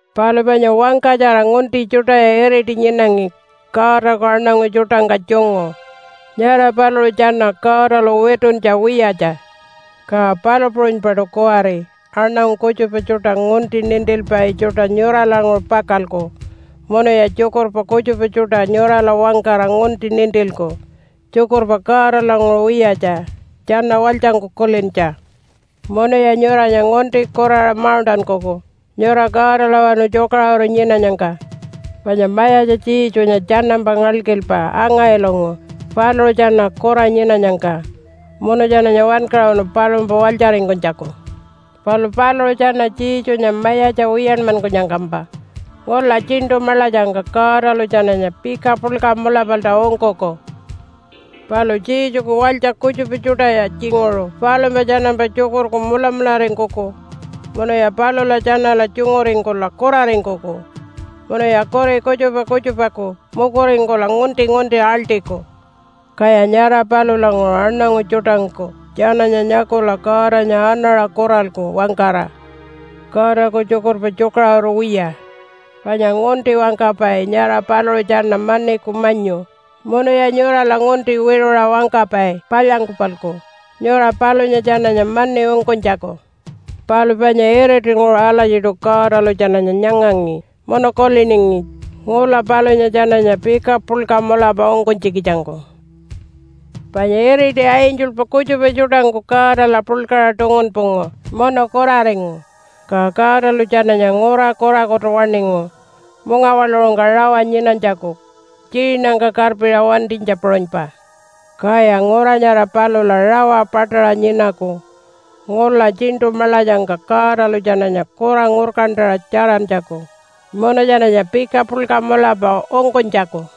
Palu panya wangkatjara ngunti tjuṯaya iriti nyinangi Godaku aṉangu tjuṯangka tjungu. Nyara paluṟu tjana Godalu wituntja wiyatja. Ka palu puṟunypaṯu kuwari aṉangu kutjupa tjuṯa ngunti nintilpai tjuṯa nyuralanguṟu pakalku munuya tjukurpa kutjupa tjuṯa nyurala wangkara ngunti nintilku tjukurpa Godalanguṟu wiyatja tjana walytjangku kulintja. Munuya nyuranya ngunti kuraṟa mauṉṯankuku nyura Godalawanu tjukaṟuru nyinanyangka. Panya Mayatja Jesunya tjanampa ngalkilpa anga-ilungu paluṟu tjana kura nyinanyangka munu tjananya wankaṟunu palumpa walytjaringkunytjaku. Palu paluṟu tjana Jesunya mayatja wiyanmankunyangkampa ngula tjiṉṯu maḻatjangka Godalu tjananya pika puḻka mulapalta ungkuku. Palu Jesuku walytja kutjupa tjuṯaya tjinguṟu palumpa tjanampa tjukurku mulamularingkuku munuya palula tjanala tjunguringkula kuraringkuku munuya kuri kutjupa kutjupaku mukuringkula ngunti-ngunti aḻṯiku. Kaya nyara palulanguṟu aṉangu tjuṯangku tjananya nyakula Godanya anaṟa kuralku wangkara, “Godaku tjukurpa tjukaṟuru wiya.” Panya ngunti wangkapai nyara paluṟu tjana maniku manyu munuya nyurala ngunti wiṟuṟa wangkapai palyangku-palku nyura palunya tjananya mani ungkunytjaku. Palu panya iritinguṟu alatjiṯu Godalu tjananya nyangangi munu kuliningi ngula palunya tjananya pika puḻka mulapa ungkunytjikitjangku. Panya iriti angelpa kutjupa tjuṯangku Godala puḻkaṟa tungunpungu munu kuraringu. Ka Godalu tjananya ngura kurakutu waṉingu mungawaḻuṟungka rawa nyinanytjaku tjiinangka karpiṟa wantinytja puṟunypa. Kaya ngura nyara palula rawa paṯaṟa nyinaku ngula tjiṉṯu maḻatjangka Godalu tjananya kura ngurkantaṟa tjarantjaku munu tjananya pika puḻka mulapa ungkunytjaku.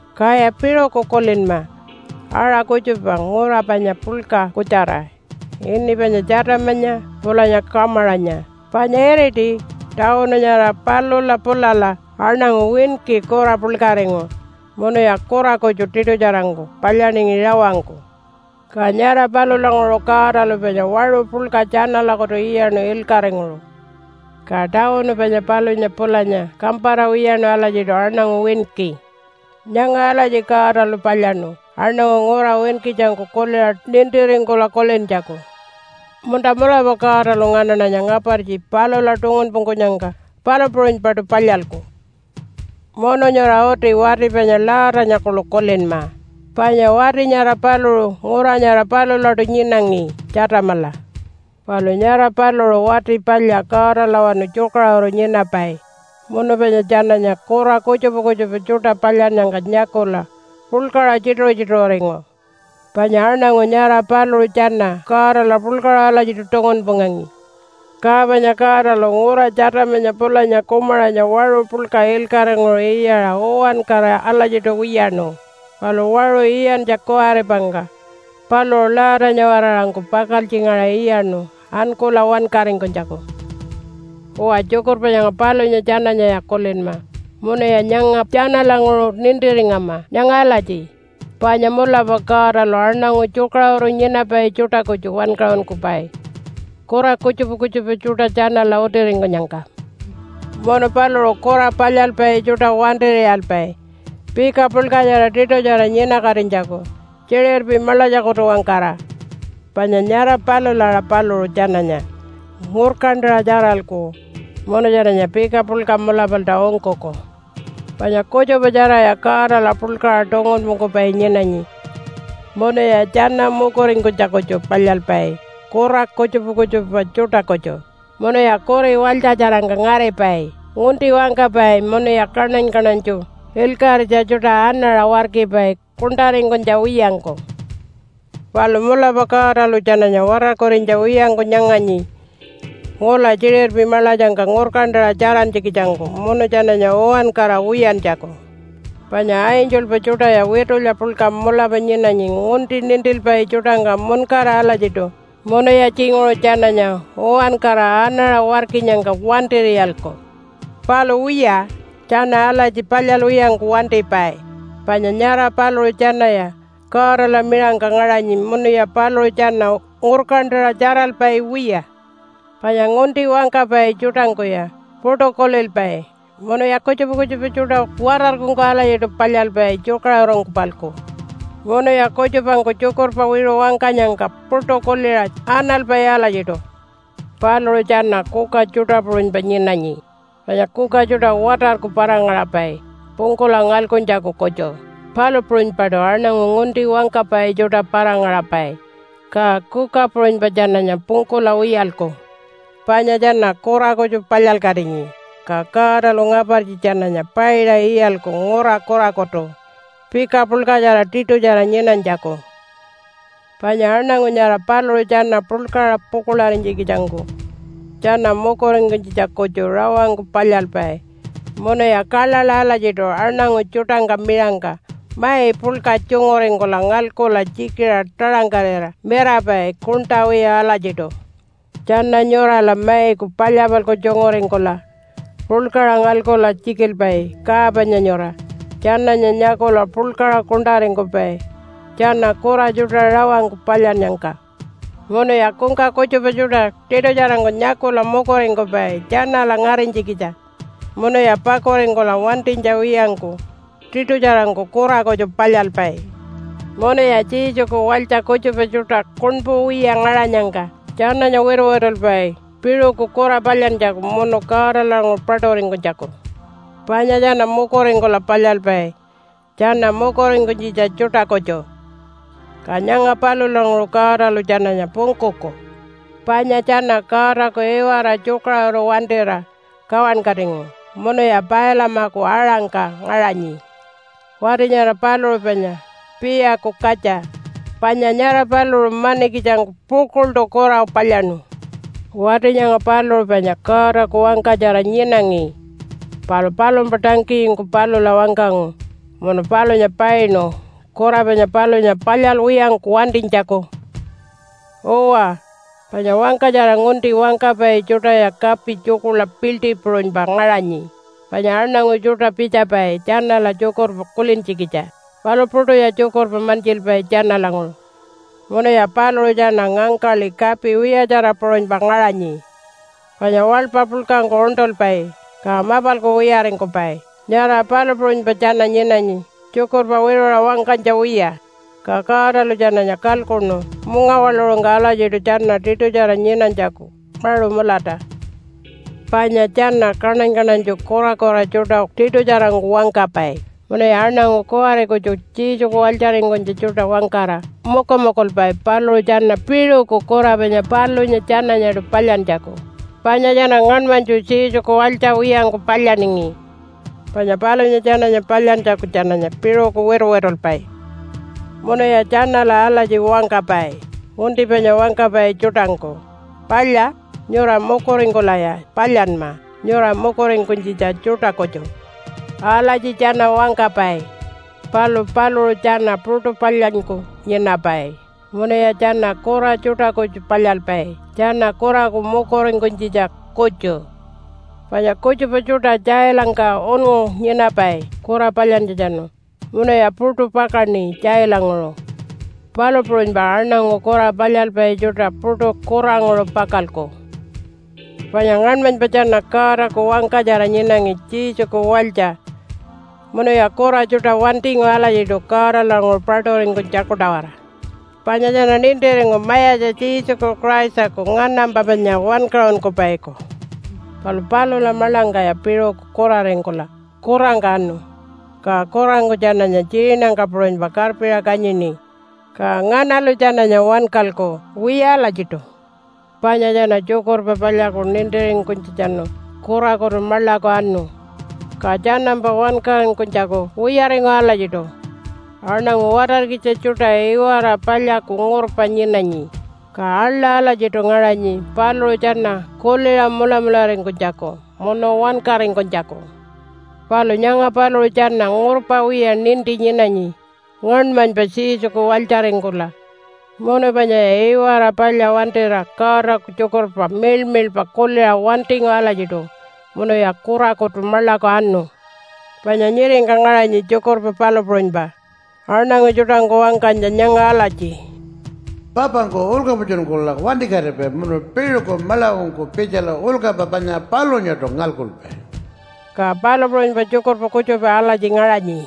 Kaya piṟuku kulinma aṟa kutjupa ngura panya puḻka kutjara ini panya Tjatamanya pulanya Kumaranya. Panya iriti tawunu nyara palula pulala aṉangu winki kura puḻkaringu munuya kura kutju tiṯutjarangku palyaningi rawangku. Ka nyara palulanguṟu Godalu panya waṟu puḻka tjanalakutu iyaṉu ilkaṟinguṟu. Ka tawunu panya palunya pulanya kampara wiyaṉu alatjiṯu aṉangu winki. Nyanga alatji Godalu palyaṉu aṉangu ngura winkitjangku kuliṟa nintiringkula kulintjaku, “Munta mulapa Godalu nganaṉanya ngapartji palula tungunpungkunyangka palu puṟunypaṯu palyalku.” Munu nyura uti wati panya Lotanya kuḻu kulinma, panya wati nyara paluṟu ngura nyara palulaṯu nyinangi, Tjatamala. Palu nyara paluṟu wati palya Godalawanu tjukaṟuru nyinapai munu panya tjananya kura kutjupa kutjupa tjuṯa palyannyangka nyakula puḻkaṟa tjituṟu-tjituṟuringu, panya aṉangu nyara paluṟu tjana Godala puḻkaṟa alatjiṯu tungunpungangi. Ka panya Godalu ngura Tjatamanya pulanya Kumaranya waṟu puḻka ilkaṟinguṟu iyaṟa uwankara alatjiṯu wiyaṉu, palu waṟu iyantja kuwaripangka paluṟu Lotanya-waraṟangku pakaltjingaṟa iyaṉu ankula wankaringkunytjaku. Uwa, tjukurpa nyanga palunya tjananyaya kulinma munuya nyanga tjanalanguṟu nintiringama nyanga alatji, panya mulapa Godalu aṉangu tjukaṟuru nyinapai tjuṯa kutju wankaṟunkupai kura kutjupa kutjupa tjuṯa tjanala utiringkunyangka. Munu paluṟu kura palyalpai tjuṯa wantir'iyalpai pika puḻkatjara tiṯutjara nyinakatinytjaku tjiṟirpi maḻatjakutu-wangkara, panya nyara palula aṟa paluṟu tjananya ngurkantaṟa tjaralku munu tjananya pika puḻka mulapalta ungkuku. Panya kutjupa tjaraya Godala puḻkaṟa tungunpungkupai nyinanyi munuya tjana mukuringkunytja kutju palyalpai kura kutjupa kutjupa tjuṯa kutju, munuya kuri walytjatjarangka ngaripai, ngunti wangkapai munuya kaṉany-kaṉanytju ilkaṟitja tjuṯa anaṟa warkipai kuṉṯaringkunytja wiyangku. Palu mulapa Godalu tjananya watarkurinytja wiyangku nyanganyi ngula tjiṟirpi maḻatjangka ngurkantaṟa tjarantjikitjangku munu tjananya uwankara wiyantjaku. Panya angelpa tjuṯaya witulya puḻka mulapa nyinanyi ngunti nintilpai tjuṯangka muṉkara alatjiṯu munuya tjinguṟu tjananya uwankara anaṟa warkinyangka wantir'iyalku. Palu wiya, tjana alatji palyalwiyangku wantipai, panya nyara paluṟu tjanaya Godala miṟangka ngaṟanyi munuya paluṟu tjana ngurkantaṟa tjaralpai wiya. Panya ngunti wangkapai tjuṯangkuya puṯu kulilpai munuya kutjupa kutjupa tjuṯa watarkungku alatjiṯu palyalpai tjukaṟurungku-palku. Munuya kutjupangku tjukurpa wiṟu wangkanyangka puṯu kuliṟa analpai alatjiṯu. Paluṟu tjana kuka tjuṯa puṟunypa nyinanyi, panya kuka tjuṯa watarku para-ngaṟapai pungkula ngalkuntjaku kutju. Palu puṟunypaṯu aṉangu ngunti wangkapai tjuṯa para-ngaṟapai, ka kuka puṟunypa tjananya pungkula wiyalku. Panya tjana kura kutju palyalkatinyi, ka Godalu ngapartji tjananya paiṟa iyalku ngura kurakutu pika puḻkatjara tiṯutjara nyinanytjaku. Panya aṉangu nyara paluṟu tjana puḻkaṟa pukuḻarinytjikitjangku tjana mukuringkunytjitja kutju rawangku palyalpai munuya kaḻaḻa alatjiṯu aṉangu tjuṯangka miṟangka mai puḻka tjunguringkula ngalkula tjikiṟa taṟangkarira mirapai kuṉṯa wiya alatjiṯu. Tjana nyurala maiku palya-palku tjunguringkula puḻkaṟa ngalkula tjikilpai ka panya nyura tjananya nyakula puḻkaṟa kuṉṯaringkupai tjana kura tjuṯa rawangku palyannyangka. Munuya kungka kutjupa tjuṯa tiṯutjarangku nyakula mukuringkupai tjanala ngarinytjikitja munuya pakuringkula wantinytja wiyangku tiṯutjarangku kura kutju palyalpai. Munuya Jesuku walytja kutjupa tjuṯa kuṉpu wiya ngaṟanyangka tjananya wituwitulpai piṟuku kura palyantjaku munu Godalanguṟu paṯuringkunytjaku. Panya tjana mukuringkula palyalpai tjana mukuringkunytjitja tjuṯa kutju. Ka nyanga palulanguṟu Godalu tjananya pungkuku. Panya tjana Godaku iwara tjukaṟuru wantira kawankatingu munuya Pailamaku aṟangka ngaṟanyi. (Wati nyara paluṟu panya Piiyaku katja.) Panya nyara paluṟu manikitjangku pukuḻṯu kura palyaṉu. Wati nyanga paluṟu panya Godaku wangkatjara nyinangi, palu palumpa tangkiyingku palula wangkangu munu palunya painu kura panya palunya palyalwiyangku wantinytjaku. Uwa, panya wangkatjara ngunti wangkapai tjuṯaya kapi tjukuḻa piḻṯi puṟunypa ngaṟanyi, panya aṉangu tjuṯa pitjapai tjanala tjukurpa kulintjikitja, palu puṯuya tjukurpa mantjilpai tjanalanguṟu. Munuya paluṟu tjana ngangkaḻi kapi wiyatjara puṟunypa ngaṟanyi, panya waḻpa puḻkangku uṉṯulpai ka mapalku wiyaringkupai, nyara palu puṟunypa tjana nyinanyi tjukurpa wiṟuṟa wangkanytja wiya. Ka Godalu tjananya kalkuṉu mungawaḻuṟungka alatjiṯu tjana tiṯutjara nyinanytjaku maṟu mulata. Panya tjana kaṉany-kaṉanytju kurakura tjuṯa tiṯutjarangku wangkapai. Munuya aṉangu kuwari kutju Jesuku walytjaringkunytja tjuṯa wangkara mukumukulpai paluṟu tjana piṟuku kura panya palunya tjananyaṯu palyantjaku, panya tjana ngaṉmanytju Jesuku walytja wiyangku palyaningi, panya palunya tjananya palyantjaku tjananya piṟuku wituwitulpai. Munuya tjanala alatji wangkapai, ngunti panya wangkapai tjuṯangku, “Palya, nyura mukuringkulaya palyanma, nyura mukuringkunytjitja tjuṯa kutju.” Alatji tjana wangkapai, palu paluṟu tjana puṯu palyanyku nyinapai munuya tjana kura tjuṯa kutju palyalpai tjana kuraku mukuringkunytjitja kutju. Panya kutjupa tjuṯa tjailangka unngu nyinapai kura palyantjatjanu munuya puṯu pakaṉi tjailanguṟu, palu puṟunypa aṉangu kura palyalpai tjuṯa puṯu kuranguṟu pakalku. Panya ngaṉmanypa tjana Godaku wangkatjara nyinangi Jesuku walytja munuya kura tjuṯa wantingu alatjiṯu Godalanguṟu paṯuringkunytjaku-tawara. Panya tjana nintiringu Mayatja Jesuku Christaku nganampa panya Wankaṟunkupaiku. Palu palula maḻangkaya piṟuku kuraringkula kurangka anu, ka kurangku tjananya tjiinangka puṟunypa karpiṟa kanyini. Ka nganalu tjananya wankalku? Wiya alatjiṯu. Panya tjana Tjukurpa Palyaku nintiringkunytjatjanu kurakutu maḻaku anu, ka tjanampa wankaringkunytjaku wiyaringu alatjiṯu. Aṉangu watarkitja tjuṯa iwara palyaku ngurpa nyinanyi, ka aḻa alatjiṯu ngaṟanyi paluṟu tjana kuliṟa mulamularingkunytjaku munu wankaringkunytjaku. Palu nyanga paluṟu tjana ngurpa wiya ninti nyinanyi ngaṉmanypa Jesuku walytjaringkula, munu panyaya iwara palya wantira Godaku tjukurpa miḻmiḻpa kuliṟa wantingu alatjiṯu, munuya kurakutu maḻaku anu. Panya nyiringka ngaṟanyi tjukurpa palu puṟunypa aṉangu tjuṯangku wangkanytja nyanga alatji, “Papangku ulkapatjunkula wantikatipai munu piṟuku maḻakungku pitjala ulkapa panya palunyaṯu ngalkupai.” Ka palu puṟunypa tjukurpa kutjupa alatji ngaṟanyi,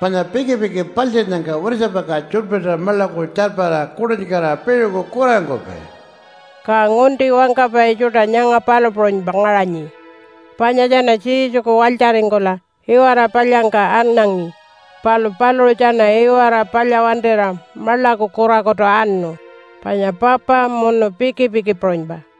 “Panya pikipiki paltjinnyangka wirtjapakaṟa tjuḻpirta maḻaku tjarpara kuṯinkatira piṟuku kuraringkupai.” Ka ngunti wangkapai tjuṯa nyanga palu puṟunypa ngaṟanyi, panya tjana Jesuku walytjaringkula iwara palyangka anangi, palu paluṟu tjana iwara palya wantira maḻaku kurakutu anu, panya papa munu pikipiki puṟunypa.